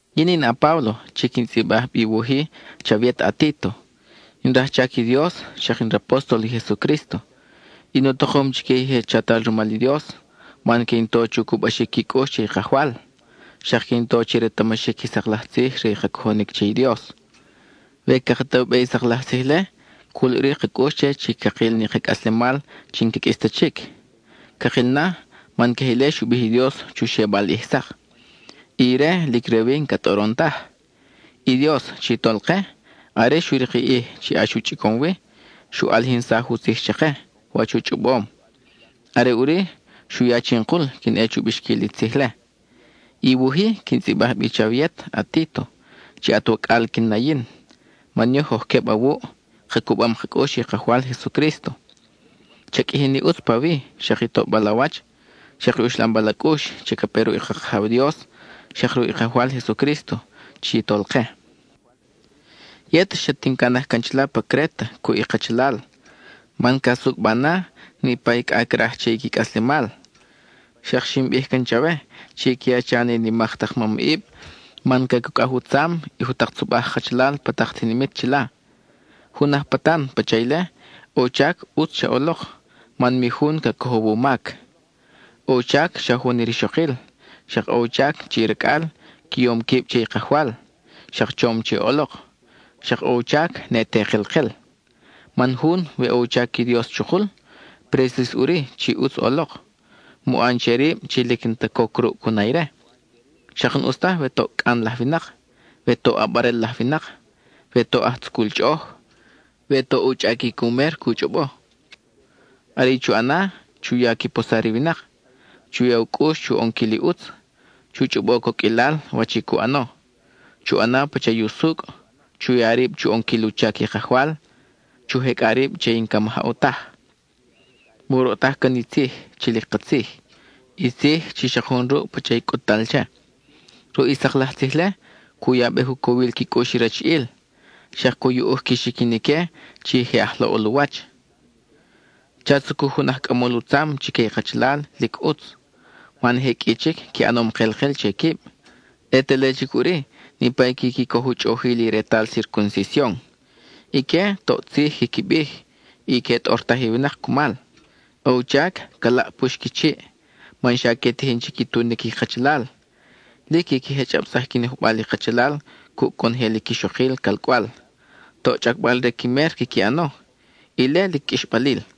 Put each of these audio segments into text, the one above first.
Yin in a-Páblo chi quin tzʼibaj bi i wuj-i chawe yet a-Títo; in rajchac i Dios, xak in rapóstol i Jesucrísto. In u takom chique i je chatal rumal i Dios, man que in to chu cubaxic qui cʼux che i Kajwal, xak que in to chi retamaxic i sak laj tzij re i ka cojonic che i Dios. We caka ta u be i sak laj tzij-le, cul ʼuri ka cʼux che chi cakil ni ka cʼaslemal chi n-ca qʼuis ta chic. Cakil na, man queje ile xu bij i Dios chu xebal ʼij sak, y ire lic re wi n-ca tʼoron taj. I Dios, chi Tolke, are xu rik i ʼij chi ʼax u chʼicom wi, xu ʼalijinsaj u tzij chake, wach u chʼobom; are ʼuri xu ya chinkul quin ʼe chu bixquil i tzij-le. I wuj-i, quin tzʼibaj bi chawe yet a-Títo, chi at wacʼal quin na yin, man yoj oj queb awuʼ ka cubam ka cʼux che i Kajwal Jesucrísto. Cha qʼuiji ni ʼutz pawi, xak i toʼbal a wach, xak i uxlambal a cʼux chi ca pe ruʼ i ka Kajaw Dios xak ruʼ i Kajwal Jesucrísto chi Tolke. Yet, xat in canaj can chila pa Créta cuʼ i kachalal, man ca sucʼba na niʼpa i cʼa craj che i qui cʼaslemal. Xak xin bij can chawe chi que a cha ni nimak tak mamʼib man cacucʼaj u tzam i jutak tzobaj kachalal pa tak tinimit chila. Jun aj patan pacha ile, ʼo u chac ʼutz cha ʼolok, man mi jun ca cojow u mac. ʼO u chac xa jun i rixokil, xak ʼo u chac chi i racʼal qui yom quib che i Kajwal, xak chom che ʼolok, xak ʼo u chac ne te kelkel. Man jun, we ʼo u chac i Dios chukul, presis ʼuri chi ʼutz ʼolok. Mu ʼan che rib chi lic n-ta coc ruʼ cu na ire; xak n-ʼus taj we toʼ cʼan laj winak, we toʼ ʼabarel laj winak, we toʼ aj tzucul chʼoʼoj, we toʼ u chʼaquic u mer cu chʼobo. Are i chu ʼana, chu ya qui posar i winak, chu ya u cʼux chu ʼonquil i ʼutz, chu chʼobo coqʼuilal wach i cu ʼano, chu ʼana pacha i usucʼ, chu ya rib chu ʼonquil u chac i Kajwal, chu jecʼa rib che i n-ca majaw taj. Mu roʼtaj can i tzij chi lic katzij, i tzij chi xak jun ruʼ pacha i cʼut-tal che. Ruʼ i sak laj tzij-le, cu yabej u cowil qui cʼux i rachiʼil, xak cu yuʼuj qui xiquin ique chi je aj laʼol u wach. Cha tzucuj jun aj cʼamol u tzam chique i kachalal lic ʼutz, man je qʼui chic qui ʼanom kelkel che quib, ʼe te le chic ʼuri niʼpa i quiqui coj u chʼojil i retal circuncision. Ique, toʼ tzij quiqui bij, y que tʼortaj i winak cumal. ʼO u chac ca laʼpux qui chiʼ, man xa que tijin chi qui tunic i kachalal; lic quiqui jechʼabsaj qui nojbal i kachalal cuʼ conojel i quixokil calcʼwal, toʼ chʼacbal-re qui mer quiqui ʼano; ile lic qʼuixbalil.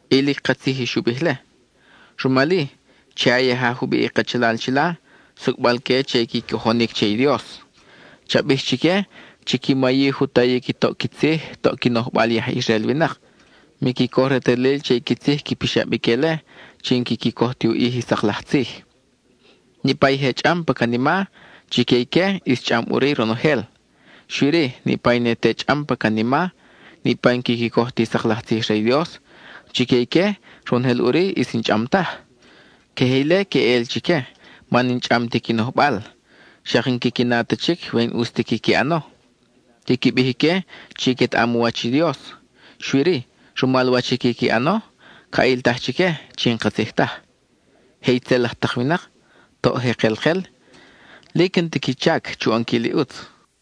Y lic katzij i xu bij-le. Rumal-i, che a yaja jubiʼ i kachalal chila, sucʼbal que che i qui cojonic che i Dios. Cha bij chique, chiqui mayij u tayic i toʼ qui tzij, toʼ qui nojbal i aj Israel winak; miqui coj retalil che i qui tzij qui pixab ique-le chi n-quiqui coj ti u ʼij i sak laj tzij. Niʼpa i je chʼam pa canima, chique ique, ʼis chʼam ʼuri ronojel. Xui-ri, niʼpa i ne te chʼam pa canima, niʼpa i n-quiqui coj ti sak laj tzij re i Dios, chique ique, ronojel ʼuri ʼis n-chʼam taj. Queje ile queʼel chique man n-chʼam ti qui nojbal, xak n-quiqui na ta chic we n-ʼus ta quiqui ʼano. Quiqui bij ique chi quetaʼam u wach i Dios, xui-ri, rumal wach i quiqui ʼano, ca ʼiltaj chique chi n-katzij taj. Je itzel laj tak winak, toʼ je kelkel, lic n-ta qui chac chu ʼonquil i ʼutz.